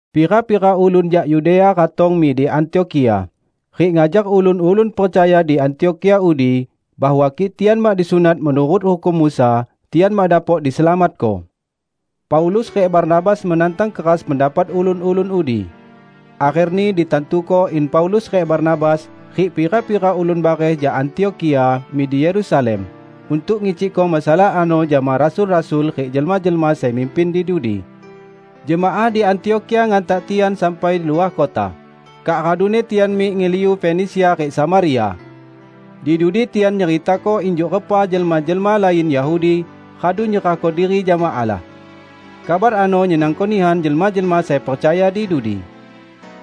Pira-pira ulun jak Yudea ratong mik Antiokhia rik ngajar ulun-ulun percaya di Antiokhia udi bahwa kik tian mak disunat menurut hukum Musa, tian mak dapok diselamatko. Paulus rik Barnabas menantang keras pendapat ulun-ulun udi. Akherni ditantuko in Paulus rik Barnabas rik pira-pira ulun bareh jak Antiokhia mik di Yerusalem untuk ngicikko masalah ano jama rasul-rasul rik jelma-jelma sai mimpin di dudi. Jemaah di Antiokhia ngantak tian sampai luah kota, kak raduni tian mik ngeliu Fenisia rik Samaria. Di dudi tian nyeritako injuk repa jelma-jelma lain Yahudi radu nyerahko diri jama Allah. Kabar ano nyenangko nihan jelma-jelma sai percaya di dudi.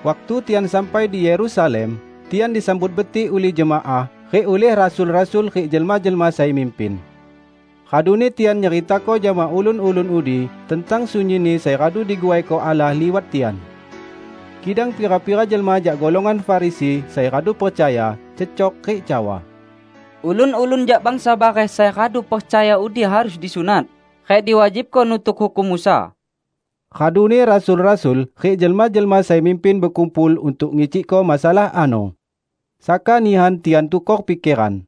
Waktu tian sampai di Yerusalem, tian disambut betik ulih jemaah, rik ulih rasul-rasul rik jelma-jelma sai mimpin. Raduni tian nyeritako jama ulun-ulun udi tentang sunyinni sai radu diguaiko Allah liwat tian. Kidang pira-pira jelma jak golongan Farisi sai radu percaya, cecok rik cawa, "Ulun-ulun jak bangsa bareh sai radu percaya udi harus disunat rik diwajibko nutuk hukum Musa." Raduni rasul-rasul rik jelma-jelma sai mimpin bekumpul untuk ngicikko masalah ano. Saka nihan tian tukor pikeran.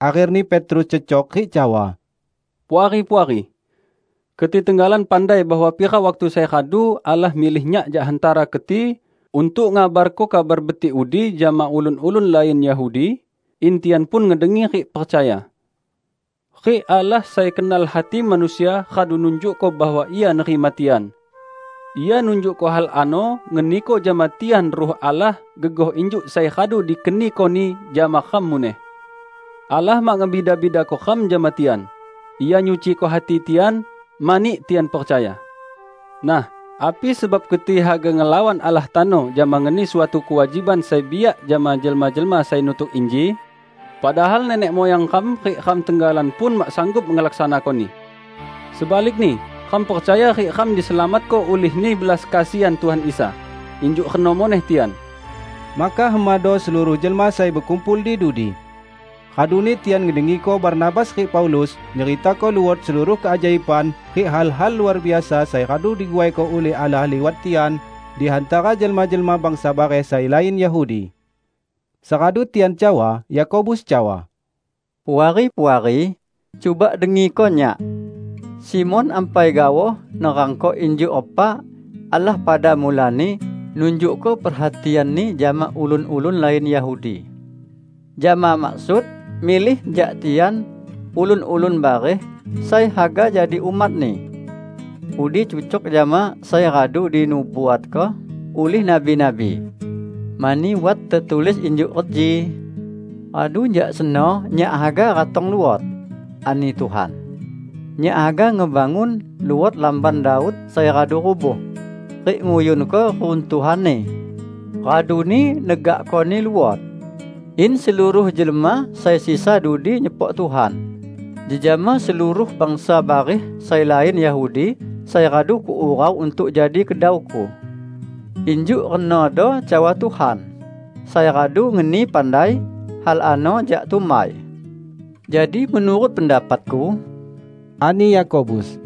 Akherni Petrus cecok rik cawa, "Puari-puari! Keti tenggalan pandai bahwa pira waktu sai radu Allah milih nyak jak hantara keti untuk ngabarko Kabar Betik udi jama ulun-ulun lain Yahudi, in tian pun ngedengi rik percaya. Rik Allah sai kenal hati manusia radu nunjukko bahwa Ia nerima tian; Ia nunjukko hal ano ngeniko jama tian Ruh Allah gegoh injuk sai radu dikeniko-Ni jama ram muneh. Allah mak ngebida-bidako ram jama tian. Ia nyuciko hati tian, mani tian percaya. Nah, api sebab keti haga ngelawan Allah tano jama ngeni suatu kewajiban sai biak jama jelma-jelma sai nutuk inji, padahal nenek muyang ram rik ram tenggalan pun mak sanggup ngelaksanakoni. Sebalikni, ram percaya rik ram diselamatko ulihni belas kesian Tuhan Isa; injuk reno muneh tian." Maka hemado seluruh jelma sai bekumpul di dudi. Raduni tian ngedengiko Barnabas rik Paulus nyeritako luot seluruh keajaiban rik hal-hal luar biasa sai radu diguaiko ulih Allah liwat tian di hantara jelma-jelma bangsa bareh sai lain Yahudi. Seradu tian cawa, Yakobus cawa, "Puari-puari! Cuba dengiko nyak. Simon ampai gaoh nerangko injuk repa Allah pada mulani nunjukko perhatian-Ni jama ulun-ulun lain Yahudi, jama maksud milih jak tian ulun-ulun bareh sai haga jadi umat-Ni. Udi cucok jama sai radu dinubuatko ulih nabi-nabi. Mani wat tetulis injuk reji, 'Radu jak seno Nyak haga ratong luot,' ani Tuhan, 'Nyak haga ngebangun luot lamban Daud sai radu rubuh, rik nguyunko reruntuhanni, raduni negakkoni luot; in seluruh jelma sai sisa dudi nyepok Tuhan, jejama seluruh bangsa bareh sai lain Yahudi sai radu Kuurau untuk jadi kedau-Ku.' Injuk renodo cawa Tuhan, sai radu ngeni pandai hal ano jak tumbai." "Jadi menurut pendapatku," ani Yakobus,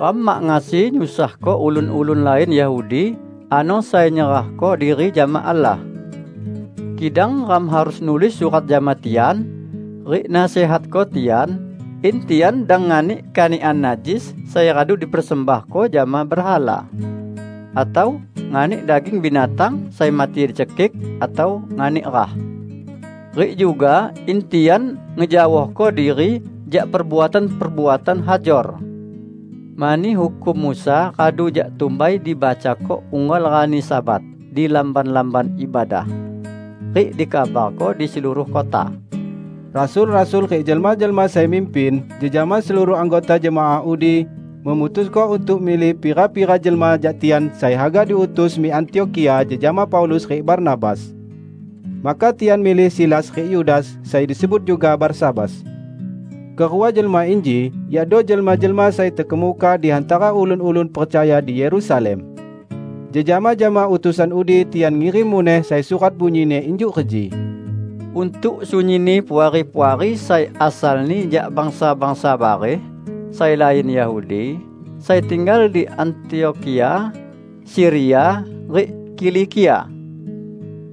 "ram mak ngasi nyusahko ulun-ulun lain Yahudi ano sai nyerahko diri jama Allah. Kidang ram harus nulis surat jama tian rik nasihatko tian in tian dang nganik kanikan najis sai radu dipersembahko jama berhala, atau nganik daging binatang sai mati dicekik, atau nganik rah. Rik juga in tian ngejaohko diri jak perbuatan-perbuatan hajor. Mani hukum Musa radu jak tumbai dibacako unggal rani Sabat di lamban-lamban ibadah, rik dikabarko di seluruh kota." Rasul-rasul rik jelma-jelma sai mimpin, jejama seluruh anggota jemaah udi memutusko untuk milih pira-pira jelma jak tian sai haga diutus mik Antiokhia jejama Paulus rik Barnabas. Maka tian milih Silas rik Yudas sai disebut juga Barsabas. Kerua jelma inji yakdo jelma-jelma sai terkemuka di hantara ulun-ulun percaya di Yerusalem. Jejama jama utusan udi tian ngirim muneh sai surat bunyini injuk reji, "Untuk sunyinni puari-puari sai asalni jak bangsa-bangsa bareh sai lain Yahudi, sai tinggal di Antiokhia, Siria rik Kilikia.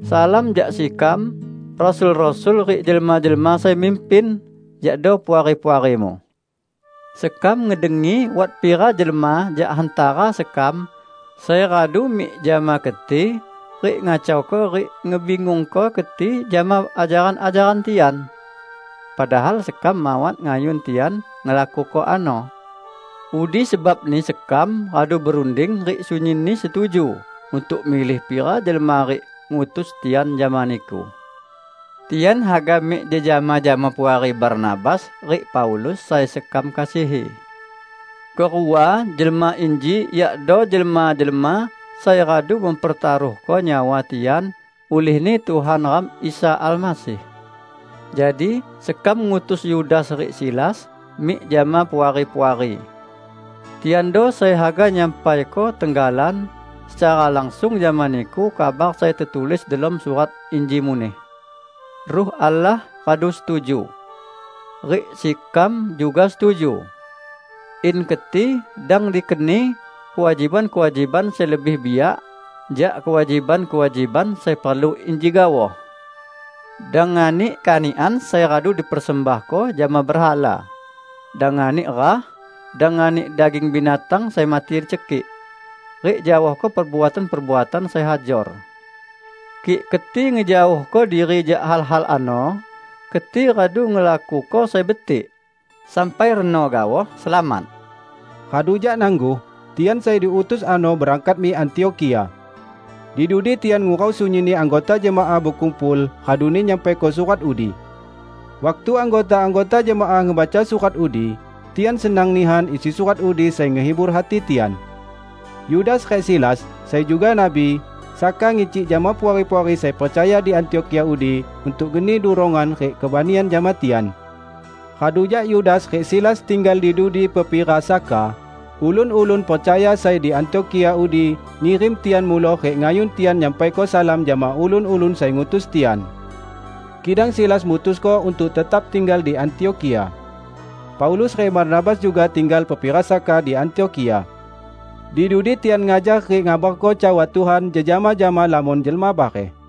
Salam jak sekam, rasul-rasul rik jelma-jelma sai mimpin, yakdo puari-puarimu. Sekam ngedengi wat pira jelma jak hantara sekam sai radu mik jama keti rik ngacauko rik ngebingungko keti jama ajaran-ajaran tian. Padahal sekam mawat ngayun tian ngelakuko ano. Udi sebabni sekam radu berunding rik sunyinni setuju untuk milih pira jelma rik ngutus tian jama niku. Tian haga mik jejama jama Puari Barnabas rik Paulus sai sekam kasihi. Kerua jelma inji yakdo jelma-jelma sai radu mempertaruhko nyawa tian ulihni Tuhan ram Isa Almasih. Jadi, sekam ngutus Yudas rik Silas mik jama Puari-puari. Tiando sai haga nyampaiko tenggalan secara langsung jama niku kabar sai tetulis delom surat inji muneh. Ruh Allah radu setuju -- rik sekam juga setuju -- in keti dang dikeni kewajiban-kewajiban sai lebih biak jak kewajiban-kewajiban sai perlu inji gaoh: dang nganik kanikan sai radu dipersembahko jama berhala; dang nganik rah, dang nganik daging binatang sai mati dicekik, rik jaohko perbuatan-perbuatan sai hajor. Kik keti ngejaohko diri jak hal-hal ano, keti radu ngelakuko sai betik. Sampai reno gaoh, selamat!" Radu jak nangguh, tian sai diutus ano berangkat mik Antiokhia. Di dudi tian ngurau sunyinni anggota jemaah bekumpul raduni nyampaiko surat udi. Waktu anggota-anggota jemaah ngebaca surat udi, tian senang nihan isi surat udi sai ngehibur hati tian. Yudas rik Silas, sai juga nabi, saka ngicik jama puari-puari sai percaya di Antiokhia udi untuk ngeni durongan rik kebanian jama tian. Radu jak Yudas rik Silas tinggal di dudi pepira saka, ulun-ulun percaya sai di Antiokhia udi ngirim tian muloh rik ngayun tian nyampaiko salam jama ulun-ulun sai ngutus tian. [ Kidang Silas mutusko untuk tetap tinggal di Antiokhia.] Paulus rik Barnabas juga tinggal pepira saka di Antiokhia. Di dudi tian ngajar rik ngabarko cawa Tuhan jejama jama lamon jelma bareh.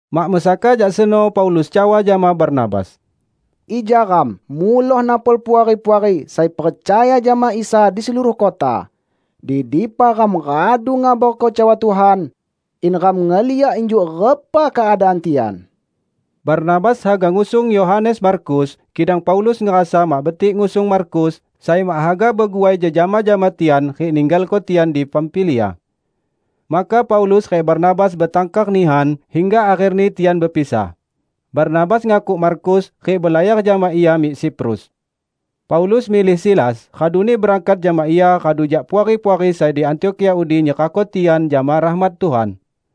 Mak mesaka jak seno Paulus cawa jama Barnabas, "Ija ram muloh napol puari-puari sai percaya jama Isa di seluruh kota di dipa ram radu ngabarko cawa Tuhan; in ram ngeliak injuk repa keadaan tian." Barnabas haga ngusung Yohanes Markus, kidang Paulus ngerasa mak betik ngusung Markus, sai mak haga beguai jejama jama tian rik ninggalko tian di Pamfilia. Maka Paulus rik Barnabas betangkar nihan hingga akherni tian bepisah: Barnabas ngakuk Markus rik belayar jama ia mik Siprus. Paulus milih Silas raduni berangkat jama ia radu jak puari-puari sai di Antiokhia udi nyerahko tian jama rahmat Tuhan.